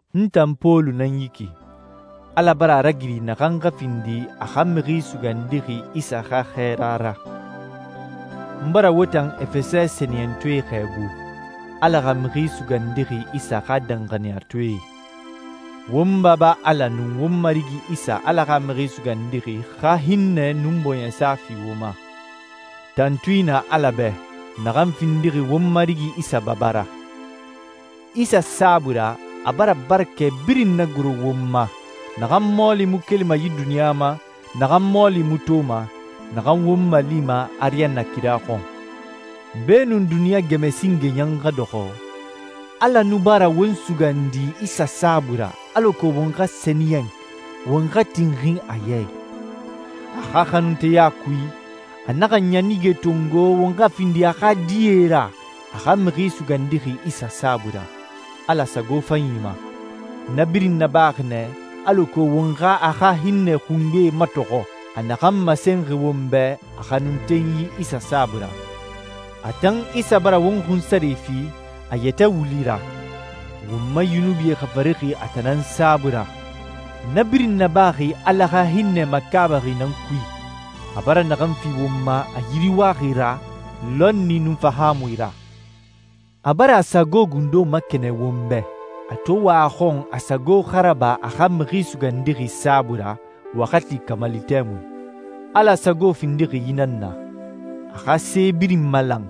N tan Pɔlu nan yi ki, Ala bara a ragiri naxan xa findi a xa Mixi Sugandixi Isa xa xɛɛra ra. N bara wo tan Efɛsɛ sɛniyɛntɔɛe xɛɛbu, Ala xa Mixi Sugandixi Isa xa danxaniyatɔɛe. Won Baba Ala nun won Marigi Isa Ala xa Mixi Sugandixi xa hinnɛ nun bɔɲɛsa fi wo ma. Tantui nan Ala bɛ, naxan findixi won Marigi Isa Baba ra. Isa saabui ra, a bara barakɛ birin nagoro won ma, naxan mɔɔli mu kelima yi duniɲa ma, naxan mɔɔli mu toma, naxan won malima ariyanna kira xɔn. Beenun duniɲa gɛmɛ singe ɲan xa dɔxɔ, Ala nu bara won sugandi Isa saabui ra alako won xa sɛniyɛn, won xa tinxin a ya i. A xa xanunteya kui, a naxa ɲanige tongo won xa findi a xa die ra a xa Mixi Sugandixi Isa saabui ra, Ala sago fanyi ma. Na birin nabaxi nɛ alako won xa a xa hinnɛ xungbe matɔxɔ, a naxan masenxi won bɛ a xanuntenyi Isa saabui ra. A tan Isa bara won xunsare fi a yɛtɛ wuli ra. Won ma yunubie xafarixi a tan nan saabui ra. Na birin nabaxi Ala xa hinnɛ makaabaxi nan kui, a bara naxan fi won ma a yiriwaxi ra, lɔnni nun fahaamui ra. A bara a sago gundo makɛnɛn won bɛ, a to wa a xɔn a sago xa raba a xa Mixi Sugandixi saabui ra waxati kamali tɛmui. Ala sago findixi yi nan na: A xa se birin malan,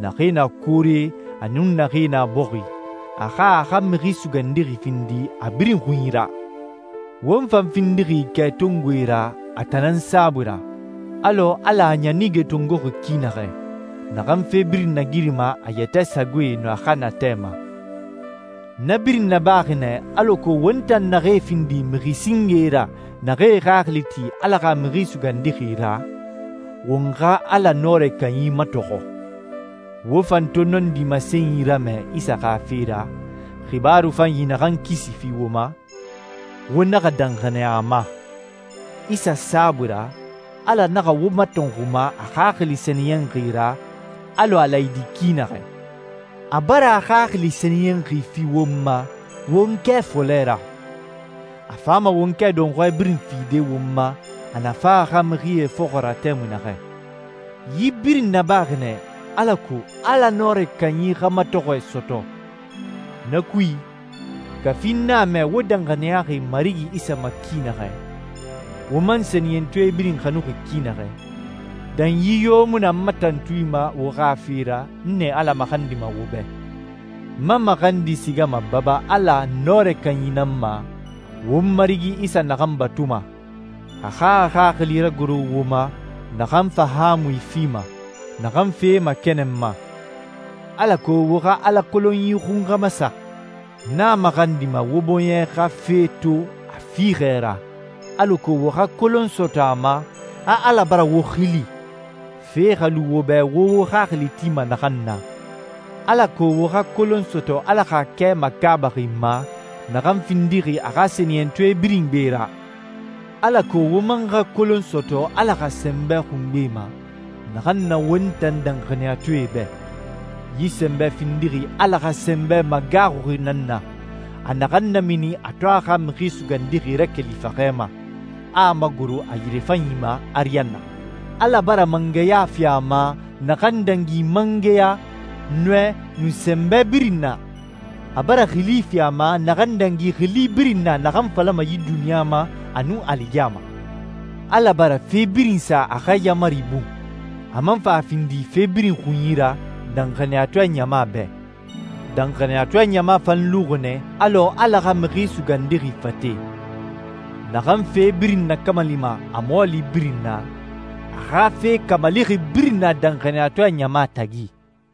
naxee na koore a nun naxee na bɔxi, a xa a xa Mixi Sugandixi findi a birin xunyi ra. Won fan findixi kɛtongoe ra a tan nan saabui ra, alɔ Ala a ɲanige tongoxi ki naxɛ, naxan fe birin nagirima a yɛtɛ sagoe nun a xa natɛ ma. Na birin nabaxi nɛ alako won tan naxee findi mixi singee ra naxee e xaxili ti Ala xa Mixi Sugandixi ra, won xa Ala Nɔrɛ Kanyi matɔxɔ. Wo fan to nɔndi masenyi ramɛ Isa xa fe ra, xibaaru fanyi naxan kisi fi wo ma, wo naxa danxaniya a ma. Isa saabui ra, Ala naxa wo matɔnxuma a Xaxili Sɛniyɛnxi ra alɔ a laayidi ki naxɛ. A bara a Xaxili Sɛniyɛnxi fi won ma won kɛ fɔlɛ ra. A fama won kɛ dɔnxɔɛ birin fide won ma a na fa a xa mixie fɔxɔ ra tɛmui naxɛ. Yi birin nabaxi nɛ alako Ala Nɔrɛ Kanyi xa matɔxɔɛ sɔtɔ. Na kui, kafi n a mɛ wo danxaniyaxi Marigi Isa ma ki naxɛ, wo man sɛniyɛntɔɛe birin xanuxi ki naxɛ, danyi yo mu na n ma tantui ma wo xa fe ra n nɛ Ala maxandima wo bɛ. N ma maxandi sigama Baba Ala Nɔrɛ Kanyi nan ma, won Marigi Isa naxan batuma, a xa a Xaxili ragoro wo ma naxan fahaamui fima, naxan fee makɛnɛnma, alako wo xa Ala kolonyi xun xa masa. N a maxandima wo bɔɲɛ xa fe to a fiixɛ ra alako wo xa kolon sɔtɔ a ma a Ala bara wo xili, fe xa lu wo bɛ wo wo xaxili tima naxan na, alako wo xa kolon sɔtɔ Ala xa kɛ makaabaxi ma naxan findixi a xa sɛniyɛntɔɛ birin gbe ra, alako wo man xa kolon sɔtɔ Ala xa sɛnbɛ xungbe ma naxan na won tan danxaniyatɔɛe bɛ. Yi sɛnbɛ findixi Ala xa sɛnbɛ magaaxuxi nan na, a naxan namini a to a xa Mixi Sugandixi rakeli faxɛ ma, a a magoro a yirefanyi ma ariyanna. Ala bara mangɛya fi a ma naxan dangi mangɛya, nɔɛ, nun sɛnbɛ birin na. A bara xili fi a ma naxan dangi xili birin na naxan falama yi duniɲa ma a nun aligiyama. Ala bara fe birin sa a xa yaamari bun, a man fa a findi fe birin xunyi ra danxaniyatɔɛ ɲama bɛ. Danxaniyatɔɛ ɲama fan luxi nɛ alɔ Ala xa Mixi Sugandixi fate. Naxan fe birin nakamalima a mɔɔli birin na, a xa fe kamalixi birin na danxaniyatɔɛ ɲama tagi.